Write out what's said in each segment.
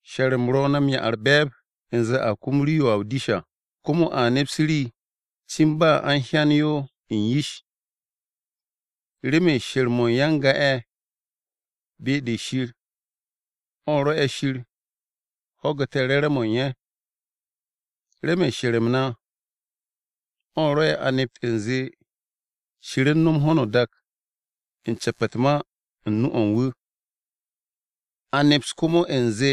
She̱r-m ro̱ na m-'ya u̱r-be̱e̱b u̱nze a kum rii-yo a o-dish à. Komo a neps rii cin ba a u̱n hyan yo u̱n yish. Remen she̱r-mo̱ u̱n ya-n-ga-ye̱ be-de Shir o̱ rwo̱'e̱ Shir ho̱gu̱te̱ re̱re̱m-mo̱ u̱n ye̱. Remen she̱r-m na, o̱ rwo̱'e̱ a nept u̱nze Shir u̱n no̱m ho̱no o-dak u̱n ce̱p u̱t-ma u̱n nu-o̱ u̱n wu̱. A neps komo u̱nze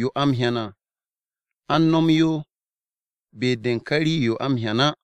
yo a m-hyan à, a u̱n no̱m yo be-de u̱n ka rii-yo a m-hyan á.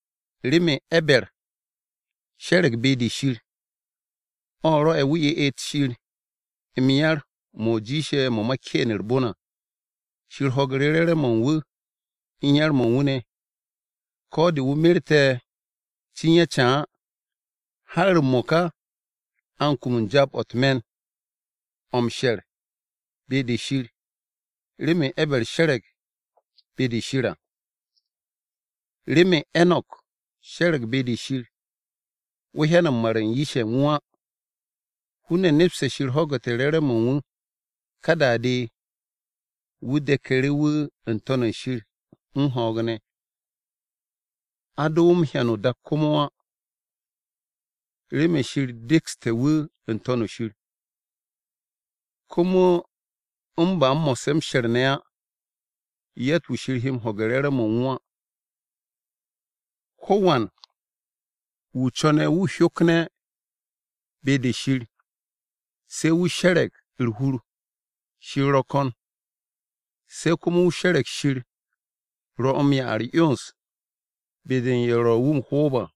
Remen E̱ber she̱re̱g be-de Shir, o̱ rwo'e̱ wu̱ ye'et Shir m-yar mo̱ jiishe̱ mo̱ ma Keen u̱r-bon à. Shir ho̱gu̱ru̱ re̱re̱m-mo̱ u̱n wu̱ u̱n yar-mo̱ u̱n wu̱ ne̱. Ko̱ de, wu̱ merte̱ cin ya ca á, har m-mo̱ka a u̱n kum u̱n jaab-o̱ u̱t-me̱n o̱ m-she̱r be-de Shir remen E̱ber she̱re̱g be-de Shir. Remen Enok she̱re̱g be-de Shir, wu̱ hyan m-mar u̱n yish-ye̱ u̱n wu̱ á. Hun-ne̱ nepste̱ Shir ho̱gu̱te̱ re̱re̱m-mo̱ u̱n wu̱. Ka da-de, wu̱ deku̱ru̱ wu̱ n-To̱n shir u̱n ho̱o̱g ne̱. A do wu̱ m-hyan o-dak komo á, remen Shir dekste̱ wu̱ n-To̱n shir. Komo u̱n ba mo̱sse̱ m-she̱r ne̱ á, yatt-wu̱ Shir he ho̱ge̱ u̱n re̱re̱m-mo̱ u̱n wu̱ á. Ko̱wan wu̱ co̱ne̱ wu̱ hyokne̱ be-de Shir, se̱ wu̱ she̱re̱g u̱r-hur Shir ro̱ ko̱n. Se̱ komo wu̱ she̱re̱g Shir ro̱ m-'ya u̱r-'yons be-de u̱n ye̱ ro̱ wu̱ m-ho̱o̱b à.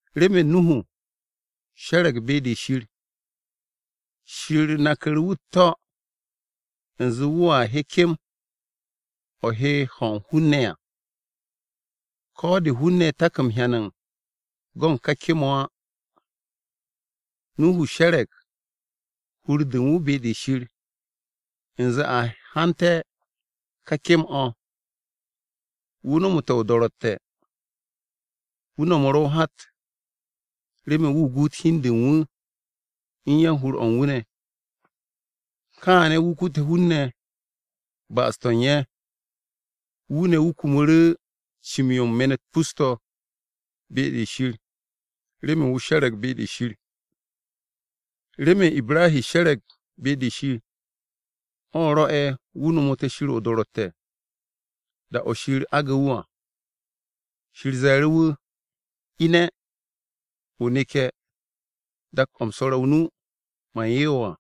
Remen Nuhu she̱re̱g be-de Shir, Shir naku̱ru̱ wu̱ u̱t-to̱ u̱nze wu̱a he kem-o̱ he ho̱ u̱n hun-ne̱ à. Ko̱ de hun-ne̱ tak m-hyan u̱n go̱ u̱n ka kem-o̱ á, Nuhu she̱re̱g hur-de u̱n wu̱ be-de Shir u̱nze a hante̱ ka kem-o̱. Wu̱ nomote̱ o-do̱ro̱tte̱, wu̱ no̱mu̱ru̱ o-hat remen wu̱ guut hi u̱n de u̱n wu̱ u̱n ya-o-hur o̱ u̱n wu̱ ne̱. Kaane̱ wu̱ kute̱ hun-ne̱ ba'as-to̱ u̱n ye̱, wu̱ ne̱ wu̱ kumu̱ru̱ cim-yo u̱n me̱n-u̱t pus-to̱ be-de Shir remen wu̱ she̱re̱g be-de Shir. Remen Ibrahi she̱re̱g be-de Shir, o̱ rwo̱'e̱ wu̱ no̱mo̱te̱ Shir o-do̱ro̱tte̱ da-o̱ Shir aage̱ wu̱ à. Shir ze̱e̱ru̱ wu̱, “Ine̱, o neke̱ dak-o̱ u̱m swo̱re̱ o-nu, man 'ye wo̱ à.”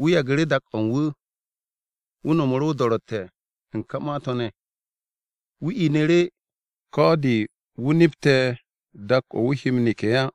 Wu̱ yagu̱ru̱ dak-o̱ u̱n wu̱. Wu̱ no̱mu̱ru̱ o-do̱ro̱tte̱ u̱n ka ma-to̱ ne̱. Wu̱ inu̱ru̱, ko̱ de wu̱ nepte̱ dak-o̱ wu̱ he m-neke̱ á.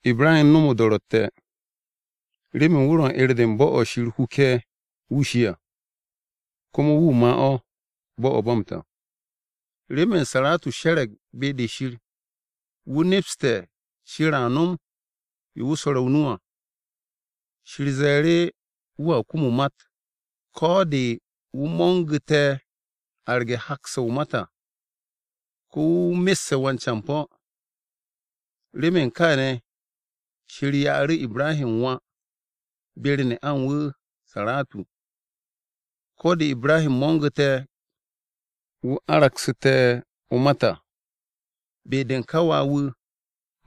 Ibrahi u̱n no̱m o-do̱ro̱tte̱ remen wu̱ ro̱ u̱n 'er-de bo̱-o̱ Shir huke̱ wu̱ shi à, komo wu̱ ma' o̱, bo̱-o̱ ba m-ta. Remen Saratu she̱re̱g be-de Shir, wu̱ nepste̱ Shir a no̱m yo wu̱ swo̱re̱ o-nu à. Shir ze̱e̱ru̱ wu̱a kum o-mat, ko̱ de wu̱ mo̱ngu̱te̱ arge̱ hak-se o-mat à. Komo wu̱ messe̱ wan-campo̱. Remen kaane̱ Shir ya'u̱ru̱ Ibrahi wà be-u̱r ne'a u̱n wu̱ Saratu, ko̱ de Ibrahi mo̱ngu̱te̱, wu̱ aragsu̱te̱ o-mat à. Be-de u̱n ka wà-wu̱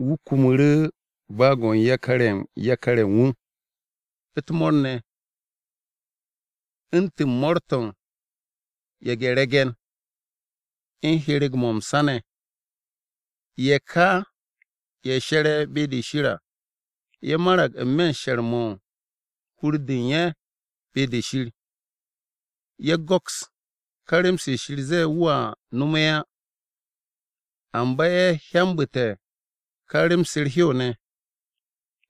wu̱ kumu̱ru̱ baag-o̱ u̱n yakar-ye̱ u̱n yakar-ye̱ u̱n wu̱ u̱t-mo̱o̱r ne̱, u̱ntu̱n mo̱o̱r-to̱ u̱n ye̱ge̱-re̱ge̱n, u̱n hyereg-mo̱ m-sa ne̱. Ye̱ ka ye̱ she̱re̱ be-de Shir à, ye̱ marag n-me̱ m-she̱r mo̱ u̱n hur-de u̱n ye̱ be-de Shir. Ye̱ go̱ks ka rem-se Shir zee wu̱a no̱mu̱ ye̱ á, amba ye̱ hyambu̱te̱ ka rem-se u̱r-hew ne̱,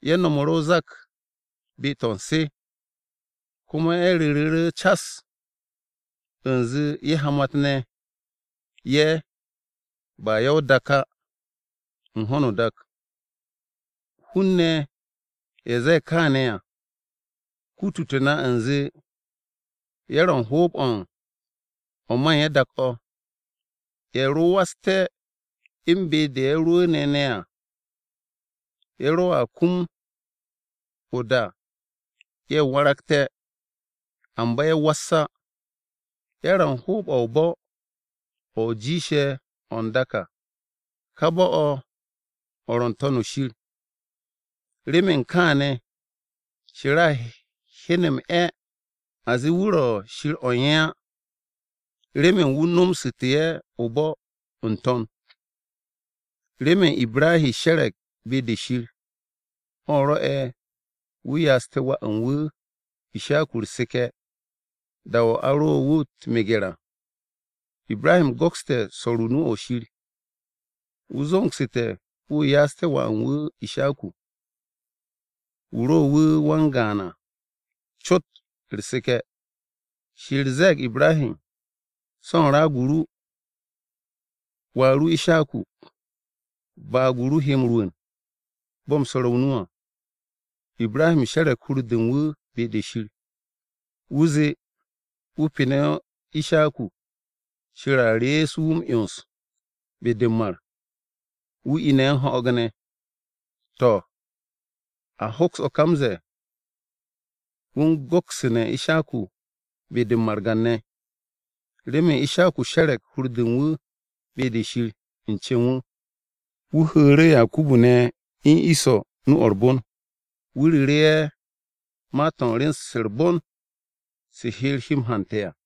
ye̱ no̱mu̱ru̱ o-zak be-to̱ u̱n se. Komo ye̱ ru̱ru̱ru̱ cas u̱nze ye̱ hamat-ne̱ ye̱, ba ya-o-dak á, u̱n ho̱no o-dak. Hun-ne̱ ye̱ ze̱e̱ kaane̱ à, kutute̱ na u̱nze ye̱ ro̱ u̱n hoob-o̱ u̱n o̱ ma u̱n ye̱ dak-o̱. Ye̱ ro waste̱ u̱n be-de ye̱ rwu̱u̱ne̱ ne̱ à, ye̱ roa kum o-da ye̱ waragte̱. Amba ye̱ was á. Ye̱ ro̱ u̱n hoob-o̱ o-bo̱ o̱ jiishe̱ o̱ n-dak à, ka bo̱-o̱, o̱ ro̱ n-To̱n shir. Remen kaane̱, Shir a hyen m-'e̱ a zee wu̱ ro̱ Shir o̱ u̱n ye̱ á, remen wu̱ nomsu̱tu̱ ye̱ o-bo̱ n-To̱n. Remen Ibrahi she̱re̱g be-de Shir, o̱ rwo̱'e̱ wu̱ ya'aste̱ wà u̱n wu̱ Ishaku u̱r-seke̱, da-o̱ a ro wu̱ m-meger à. Ibrahi go̱kste̱ swo̱o̱ru̱ nu-o̱ Shir. Wu̱ zo̱ngsu̱te̱ wu̱ ya'aste̱ wà u̱n wu̱ Ishaku wu̱ ro wu̱ wan-gaan à cot u̱r-seke̱. Shir ze̱e̱g Ibrahi, “So̱ u̱n raag-o wà ru Ishaku, baag-o ru he m-rwu̱u̱n, bo̱ u̱m swo̱re̱ o-nu à.” Ibrahi she̱re̱g hur-de u̱n wu̱ be-de Shir. Wu̱ zee wu̱ pene̱ Ishaku, Shir a rees wu̱ m-'yons be-de m-mar, wu̱ ine̱ u̱n ho̱o̱g ne̱. To̱ a hoks o̱ ka m-ze̱e̱ wu̱ u̱n go̱ksu̱ne̱ Ishaku be-de u̱n margan-ne̱. Remen Ishaku she̱re̱g hur-de u̱n wu̱ be-de Shir, u̱n cen wu̱, wu̱ hu̱u̱ru̱ Yakubu ne̱ u̱n Iso nu-o̱ u̱r-bon. Wu̱ ru̱ru̱ ye̱, ma-to̱ rem-se u̱r-bon se Shir he ye̱ m-hante̱ à.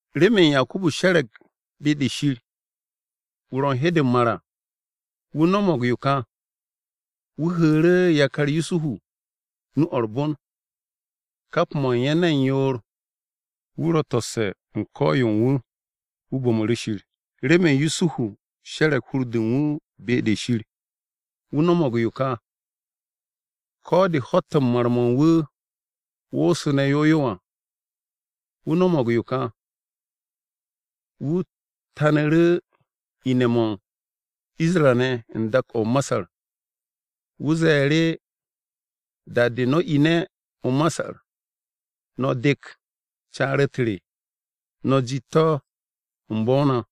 Remen Yakubu she̱re̱g be-de Shir, da-o̱ wu̱ ro̱ u̱n he de m-mar à, wu̱ no̱mo̱g yo ka: Wu̱ hu̱u̱ru̱ yakar Yusuhu nu-o̱ u̱r-bon, kap mo̱ u̱n ye̱ ne̱n yoor. Wu̱ ro̱ to̱sse̱ u̱n ko̱-yo u̱n wu̱, wu̱ bo̱mu̱ru̱ Shir. Remen Yusuhu she̱re̱g hur-de u̱n wu̱ be-de Shir, wu̱ no̱mo̱g yo ka: Ko̱ de ho̱-to̱ u̱n mar-mo̱ u̱n wu̱ woosu̱ne̱ yow yow à, wu̱ no̱mo̱g yo kà: Wu̱ tanu̱ru̱ ine̱-mo̱ u̱n Isra-ne̱ u̱n dak-o̱ o-Masar. Wu̱ ze̱e̱ru̱, “Da-de no̱ ine̱ o-Masar, no̱ dek caar-u̱t re, no̱ jiit to̱ u̱n bo̱-o na.”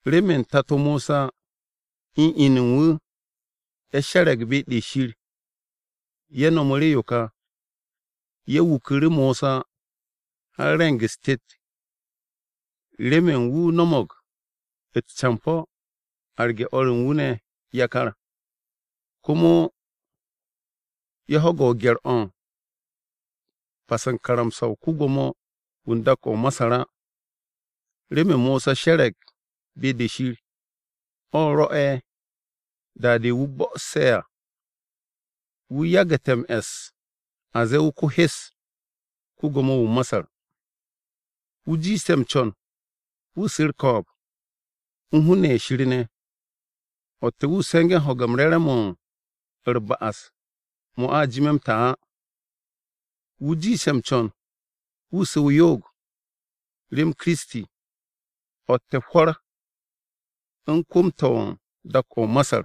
Remen tato Mosa u̱n inu u̱n wu̱ ye̱ she̱re̱g be-de Shir, ye̱ nomoru̱ yo ka: Ye̱ wuku̱ru̱ Mosa har re̱ng-u̱s tet remen wu̱ no̱mo̱g u̱t-campo̱ arge̱ o̱r u̱n wu̱ ne̱ yakar. Komo ye̱ ho̱ge̱ gye̱r-o̱ u̱n pas u̱n karamsa-o̱ ko-Gwo̱mo-wu̱ u̱n dak-o̱ o-Masar á. Remen Mosa she̱re̱g be-de Shir, o̱ rwo̱'e̱ da-de wu̱ bo̱'o̱se̱ à, wu̱ yagu̱te̱ m-e̱s a zee wu̱ ko-hes ko-Gwo̱mo-wu̱ o-Masar. Wu̱ jiishte̱ m-co̱n wu̱ su̱ u̱r-ko̱o̱b u̱n hun-ne̱ ye̱ Shir ne̱, o̱tte̱ wu̱ se̱nge̱ ho̱ge̱ u̱n re̱re̱m-mo̱ u̱r-ba'as mo̱ a jime̱ m-ta á. Wu̱ jiishte̱ m-co̱n wu̱ su̱ o-yo'og rem Kiristi, o̱tte̱ hwo̱r u̱n kwu̱m-to̱ u̱n dak-o̱ o-Masar,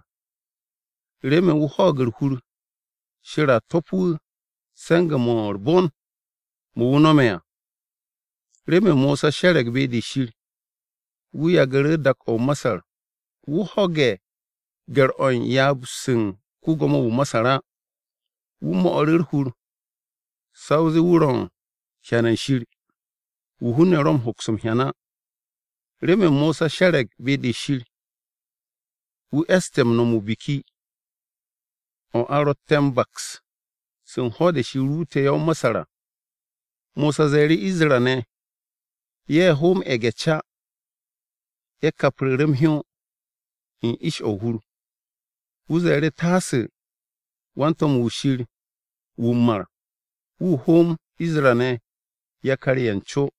remen wu̱ hwo̱o̱g u̱r-hur Shir a to̱p wu̱ se̱nge̱-mo̱ u̱r-bon mo̱ wu̱ no̱me̱ à. Remen Mosa she̱re̱g be-de Shir, wu̱ yagu̱ru̱ dak-o̱ o-Masar. Wu̱ ho̱ge̱ gye̱r-o̱ u̱n ryaab-se u̱n ko-Gwo̱mo-wu̱ o-Masar á. Wu̱ mo̱'u̱ru̱ u̱r-hur, sa o zee wu̱ ro̱ u̱n hyan u̱n Shir wu̱ hun-ne̱ ro̱ m-hoks m-hyan á. Remen Mosa she̱re̱g be-de Shir, wu̱ e̱ste̱ m-no̱m Biki-o̱ m-Pas o̱ a ro̱tte̱ m-baks u̱n ho̱-de Shir ruute̱ ye̱ o-Masar à. Mosa ze̱e̱ru̱ Isra-ne̱ ye̱ hoom ye̱ge̱-ca, ye̱ kapru̱ru̱ m-hyó u̱n ish-o̱ o-hur. Wu̱ ze̱e̱ru̱ taasu̱ wan-to̱m-wu̱ Shir wu̱ m-mar wu̱ hoom Isra-ne̱ yakar-ye̱ n-co.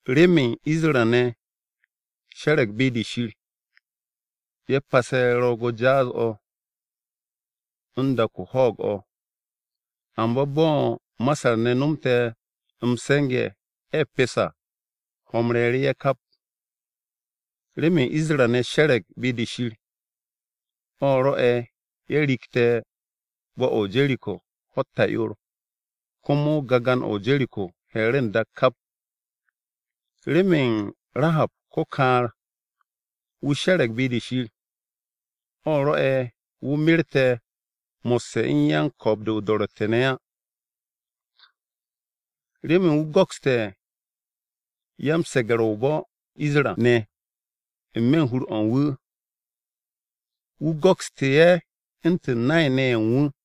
Remen Isra-ne̱ she̱re̱g be-de Shir, ye̱ pase̱ Ro̱o̱g-o̱ Jaas-o̱ u̱n dak-o̱ hwo̱'o̱g-o̱. Amba bo̱ Masar-ne̱ no̱mte̱ m-se̱nge̱ ye̱ pest à, ho̱-m re̱e̱ru̱ ye̱ kap. Remen Isra-ne̱ she̱re̱g be-de Shir, o̱ rwo̱'e̱ ye̱ riigte̱ bo̱-o̱ o-Jeriko ho̱-u̱t ta'yoor komo gagan o̱ o-Jeriko he̱e̱ru̱ n-dak kap. Remen Rahab ko-kaar-wu̱ she̱re̱g be-de Shir, o̱ rwo̱'e̱ wu̱ merte̱, mo̱sse̱ u̱n yan-ko̱o̱b-de o-do̱ro̱tte̱ ne̱ á, remen wu̱ go̱kste̱ ya-m-se̱ge̱r o-bo̱ Isra-ne̱ n-me̱ u̱n hur-o̱ u̱n wu̱, wu̱ go̱kste̱ ye̱ u̱ntu̱n nay-ne̱ ye̱ u̱n wu̱.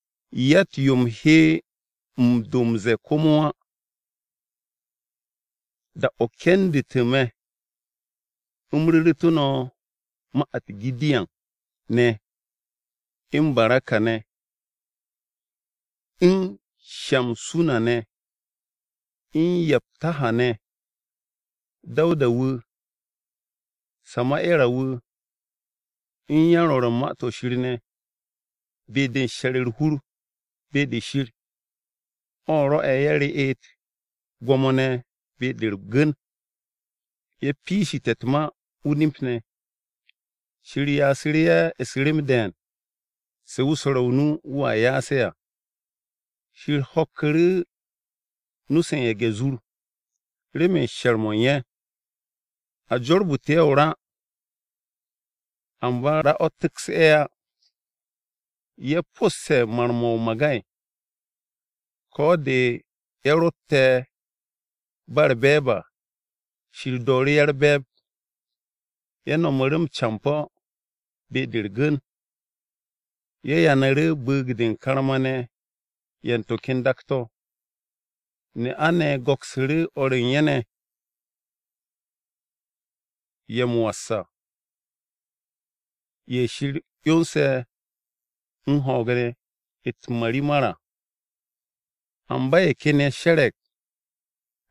Yatt-yo u̱m he do m-ze̱e̱ komo á. Da-o kendu̱tu̱ me̱ u̱m ru̱ru̱tu̱ no̱ ma-u̱t: Gidiyan ne̱, u̱n Baraka ne̱, u̱n Shamsuna ne̱, u̱n Yaptaha ne̱, Dawuda wu̱, Sama'era wu̱, u̱n yan-rwo̱ru̱ u̱n Ma-to̱ Shir ne̱. Be-de m-she̱r u̱r-hur be-de Shir o̱ rwo̱'e̱ ye̱ reet gwo̱mo-ne̱ be-de u̱r-gu̱n, ye̱ piishte̱ u̱t-ma o-nip ne̱, Shir ya'asu̱ru̱ ye̱ u̱s-rem de̱e̱n se wu̱ swo̱re̱ o-nu wu̱a ya'as ye̱ à. Shir ho̱kku̱ru̱ nu-se u̱n ye̱ge̱-zur remen she̱r-mo̱ u̱n ye̱. A jorbu̱tu̱ ye̱ o-ra, amba ra o̱ tu̱ks ye̱ á. Ye̱ po̱sse̱ mar-mo̱ o-magay. Ko̱ de ye̱ ro̱tte̱ ba u̱r-be̱e̱b à, Shir dooru̱ ye̱ u̱r-be̱e̱b. Ye̱ no̱mu̱ru̱ m-campo̱ be-de u̱r-gu̱n, ye̱ yanu̱ru̱ bu̱u̱g-de u̱n karma-ne̱ ye̱ u̱n to̱ ken dak-to̱. Ne'a-ne̱ go̱ksu̱ru̱ o̱r u̱n ye̱ ne̱, ye̱ m-was à, ye̱ Shir 'yonse̱ u̱n ho̱o̱g ne̱, u̱t-marimar à. Amba ye̱ ken ye̱ she̱re̱g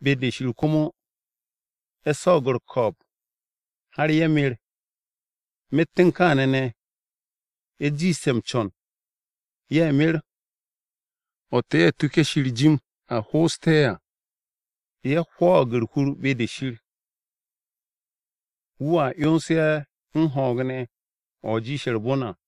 be-de Shir komo ye̱ swo̱o̱g u̱r-ko̱o̱b, har ye̱ mer. Myet u̱n kaane̱ ne̱, ye̱ jiishte̱ m-co̱n ye̱ mer o̱tte̱ ye̱ tuke̱ Shir jim a ho'oste̱ ye̱ à. Ye̱ hwo̱o̱g u̱r-hur be-de Shir wu̱a 'yons ye̱ u̱n ho̱o̱g ne̱ o̱ jiishe̱ u̱r-bon à.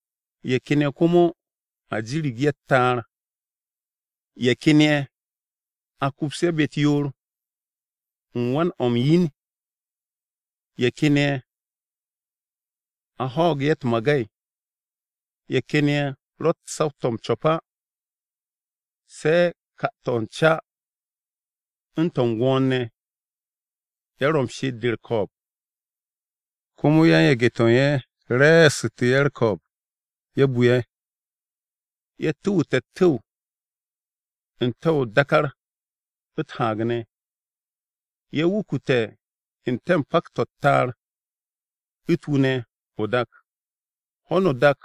Ye̱ ken ye̱ komo, a jirig ye̱ u̱t-ta'ar. Ye̱ ken ye̱, a kups ye̱ be-u̱t yoor u̱n wan-o̱ u̱n yin. Ye̱ ken ye̱, a ho̱o̱g ye̱ u̱t-magay. Ye̱ ken ye̱ rott saw-to̱ m-co̱p á se̱ ka-to̱ u̱n ca u̱n to̱ u̱n gwo̱o̱r-ne̱. Ye̱ ro̱ u̱n she'et-de u̱r-ko̱o̱b, komo yan-yage̱-to̱ u̱n ye̱ re̱e̱su̱te̱ ye̱ u̱r-ko̱o̱b, ye̱ bu ye̱. Ye̱ tu̱wu̱te̱ u̱t-tu̱w n-te̱ o-dákár u̱t-haag ne̱, ye̱ wukute̱ n-te̱ pak-to̱ u̱t-ta'ar, u̱t-wu ne̱ o-dak. Ho̱no o-dak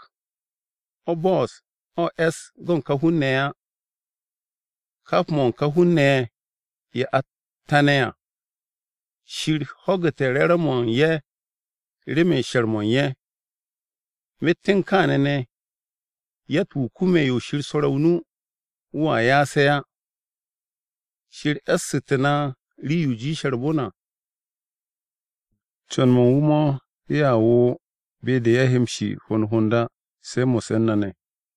o̱ bo̱'o̱s o̱ e̱s go̱ u̱n ka hun-ne̱ ye̱ á. Kap mo̱ u̱n ka hun-ne̱ ye̱, ye̱ a tane̱ à, Shir ho̱gu̱te̱ re̱re̱m-mo̱ u̱n ye̱ remen she̱r-mo̱ u̱n ye̱. Myet u̱n kaane̱ ne̱, yatt-wu̱ kume̱ yo Shir swo̱re̱ o-nu wu̱a ya'as ye̱ á. Shir e̱su̱tu̱ na rii-yo jiishe̱ u̱r-bon à. Co̱n-mo̱ u̱n wu̱ mo̱ ye̱a wo̱o̱ be-de ye̱ he m-shi hond hond á, se̱ mo̱sse̱ u̱n na ne̱.